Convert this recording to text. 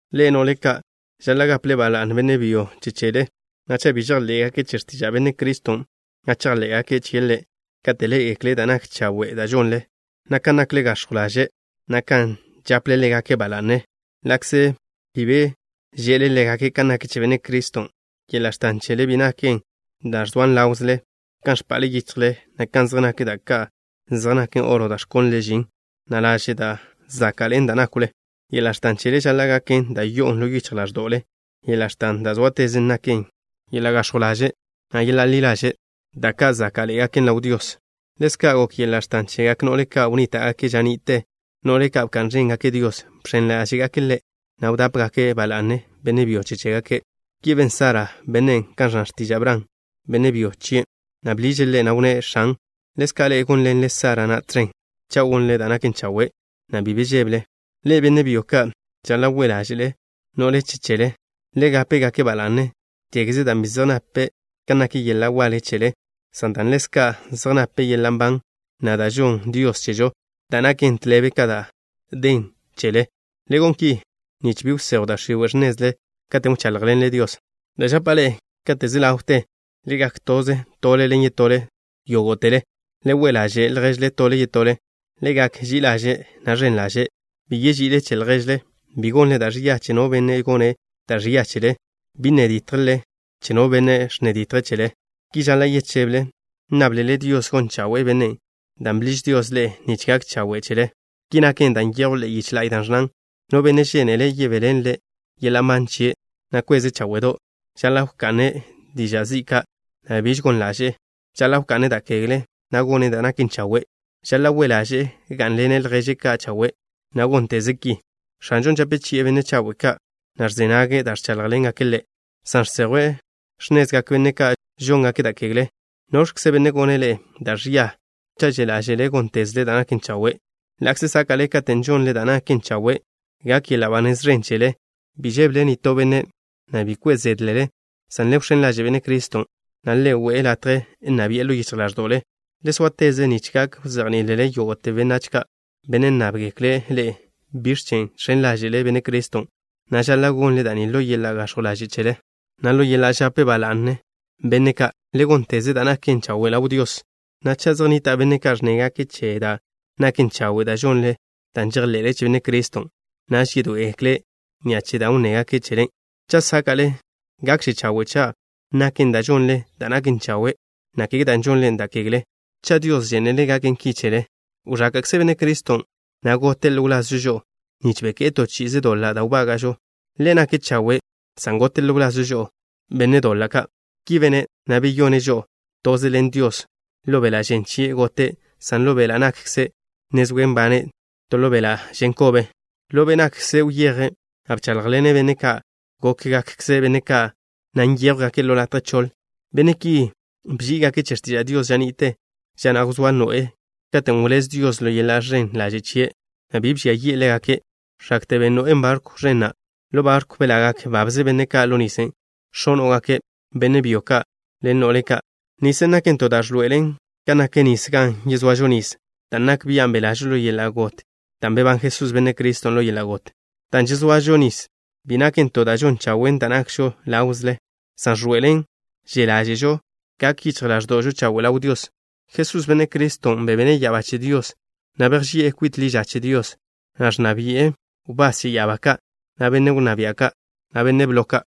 Ḻe'e, no'le ka', žaḻa' gaple ba la'ne benne' byo che chele, na' cha' bi žejḻé'gake' che x̱tiža' Benne' Criston', na' chejḻé'gake' chie' Ḻe' kate' ḻé'egekle' da' nak chawe' da' žonle, na' kan nakle gax̱jw ḻaže', na' kan žaple ḻégake' ba la'ne, ḻa'kze bi be že'le ḻégake' kan nak che Benne' Criston'. Yeḻa' x̱tan chele bi naken da' zoan ḻáwzele, kan ẕpa'le yichjle, na' kan zej nak da' ka' zej naken oro da' ẕkónlele žin, na' laže' da' záka'ḻe'en da' nákwle. Yeḻa' x̱tan chele žaḻa' gaken da' yo'on ḻo yichj ḻáẕdo'le. Yeḻa' x̱tan da' zóatezen naken yeḻa' gax̱jw ḻaže', na' yeḻa' ḻi ḻaže', da' ka' záka'ḻe'egaken ḻaw Dios. Ḻezka' gok yeḻa' x̱tan chegak no'le ka' wnníta'gake' ža ni'te, no'le ka' bka'n ẕéngake' Dios. Bx̱en ḻáže'gake' Ḻe', na' wdápegake' ba la'ne benne' byo che chégake'. Ki ben Sara. Bene' kan ẕnna x̱tiža' Bran, benne' byo chien', na' bḻiže' ḻe', na' wnné': “x̱an.” Ḻezka' ḻe'e gónḻenle Sara na' tẕen cha' gonle da' naken chawe', na' bi be žébele. Ḻe'e, benne' byo ka', žaḻa' we' ḻáže'le no'le che chele. Le gape-gake' ba la'ne, kégeze dan' bi zej nape' kan nak yeḻa' waḻe chele, san dan' ḻezka' zej nape' yeḻa' nban na', da' žonn Dios chežo, da' naken tḻebe ka da' den chele. Le gon ki, nich bi wsejw da' x̱iwe' x̱nezle katen' wcháḻjḻenle Dios. Da' žapa' ḻe'e kate' ze ḻawte: Le gak toze tole ḻen yetole yógo'tele. Le we' ḻaže' lježle tole yetole. Le gak ži'i ḻaže', na' ẕen ḻaže'. Bi yeži'ile che lježle. Bi gonle da' ẕia che no benne' gone' da' ẕia chele. Bi nne ditjle che no benne' ẕnne ditje' chele. Ki žaḻa' yecheble, nnáblele Dios gon chawe'e bennen', dan' bḻiž Dios ḻe'e nich gak chawe' chele. Ki naken dan' nyejw ḻe'e yiche la'y da' ẕnnan: No benne' žénele' yebéḻenle' yeḻa' nban chie', na' kweze' cháwe'do', žaḻa' wka'ne' diža' zi' ka', na' biž gon ḻaže'e. Žaḻa' wka'ne' da' kegle, na' gone' da' naken chawe'. Žaḻa' we' ḻaže'e gá'nḻene' lježe' ka' chawe', na' gónteze' ki. X̱anžo žape chi'e benne' chawe' ka', na' ẕze nage' da' ẕcháḻjḻengake' Ḻe', san žsejwe' x̱nezgak benne' ka' žóngake' da' kegle. ¿Noẕkze benne' gone' ḻe'e da' ẕia cha' že' ḻáže'le góntezle da' naken chawe'? Ḻa'kze sáka'le katen' žonle da' naken chawe', gak yeḻa' ba nez ẕen chele. Bi žébele nitó benne', na' bi kwe' zédlele, san le wx̱én ḻaže' Benne' Criston', na' le we'e latje nna bi'e ḻo yichj ḻáẕdo'le. Le sóateze nich gak wzejní'ilele yógo'te benne' ka', benne' nnábgekle' ḻe'e biẕ chen' žx̱en ḻáže'le Benne' Criston', na' žaḻa' gonle da' ni ḻo yeḻa' gax̱jw ḻaže' chele, na' ḻo yeḻa' žape ba la'ne benne' ka'. Le gónteze da' naken chawe' ḻaw Dios, na' cha' zej nnita' benne' ka' ẕnnégake' che da' naken chawe' da' žonle dan' žejḻe'le che Benne' Criston', naž yedoé'egekle' ni'a che da' wnnégake' chele. Cha' sáka'le, gakže chawe' cha' naken dan' žonle da' naken chawe', na' kege dan' žonle da' kegle, cha' Dios žénele' gaken ki chele. Wẕáka'kze Benne' Criston', na' gote' ḻo wlazžo žo'o nich beké'e to chi'ize doḻa' da' wbága'žo. Ḻe' nake' chawe' san gote' ḻo wlazžo žo'o, benne' doḻa' ka'. Ki bene', na' beyone' žo'o toze ḻen Dios. Ḻo beḻa' žen chie' gote', san ḻo be' nakkze' ne zoe' nbane' to ḻo beḻa' žen kobe. Ḻo be' nakkze' wyeje', na' bcháḻjḻene' be' ka' gókgakkze benne' ka', na' nyéjwgake' ḻo latje choḻ. Benne' ki bží'igake' che x̱tiža' Dios ža ni'te, ža na' wzóa Noé, katen' wléz Dios ḻo yeḻa' ẕen ḻaže' chie', na' bi bžia yi'e ḻégake', x̱akte ben Noén' barkw ẕen na'. Ḻo barkwn' belagak babze benne' ka' ḻo nisen', x̱óno'gake', benne' byo ka' ḻen no'le ka'. Nisen' naken to da' ẕḻoe'elen kan nak nis gan yezoažo nis, dan' nak bian' belažo ḻo yeḻa' got dan' bebán Jesús, Benne' Criston', ḻo yeḻa' got. Dan' žezoažo nis bi naken to da' žon chawen' da' nakžo ḻáwzele, san ẕḻoe'elen že' ḻáže'žo gak yichj ḻáẕdo'žo chawe' ḻaw Dios. Jesús, Benne' Criston', bebene' ya'abá che Dios, na' bejži'e kwit ḻi ža che Dios, na' ẕnna bi'e wbás che ya'abá ka', na' benne' wnná bia' ka', na' benne' blo ka'.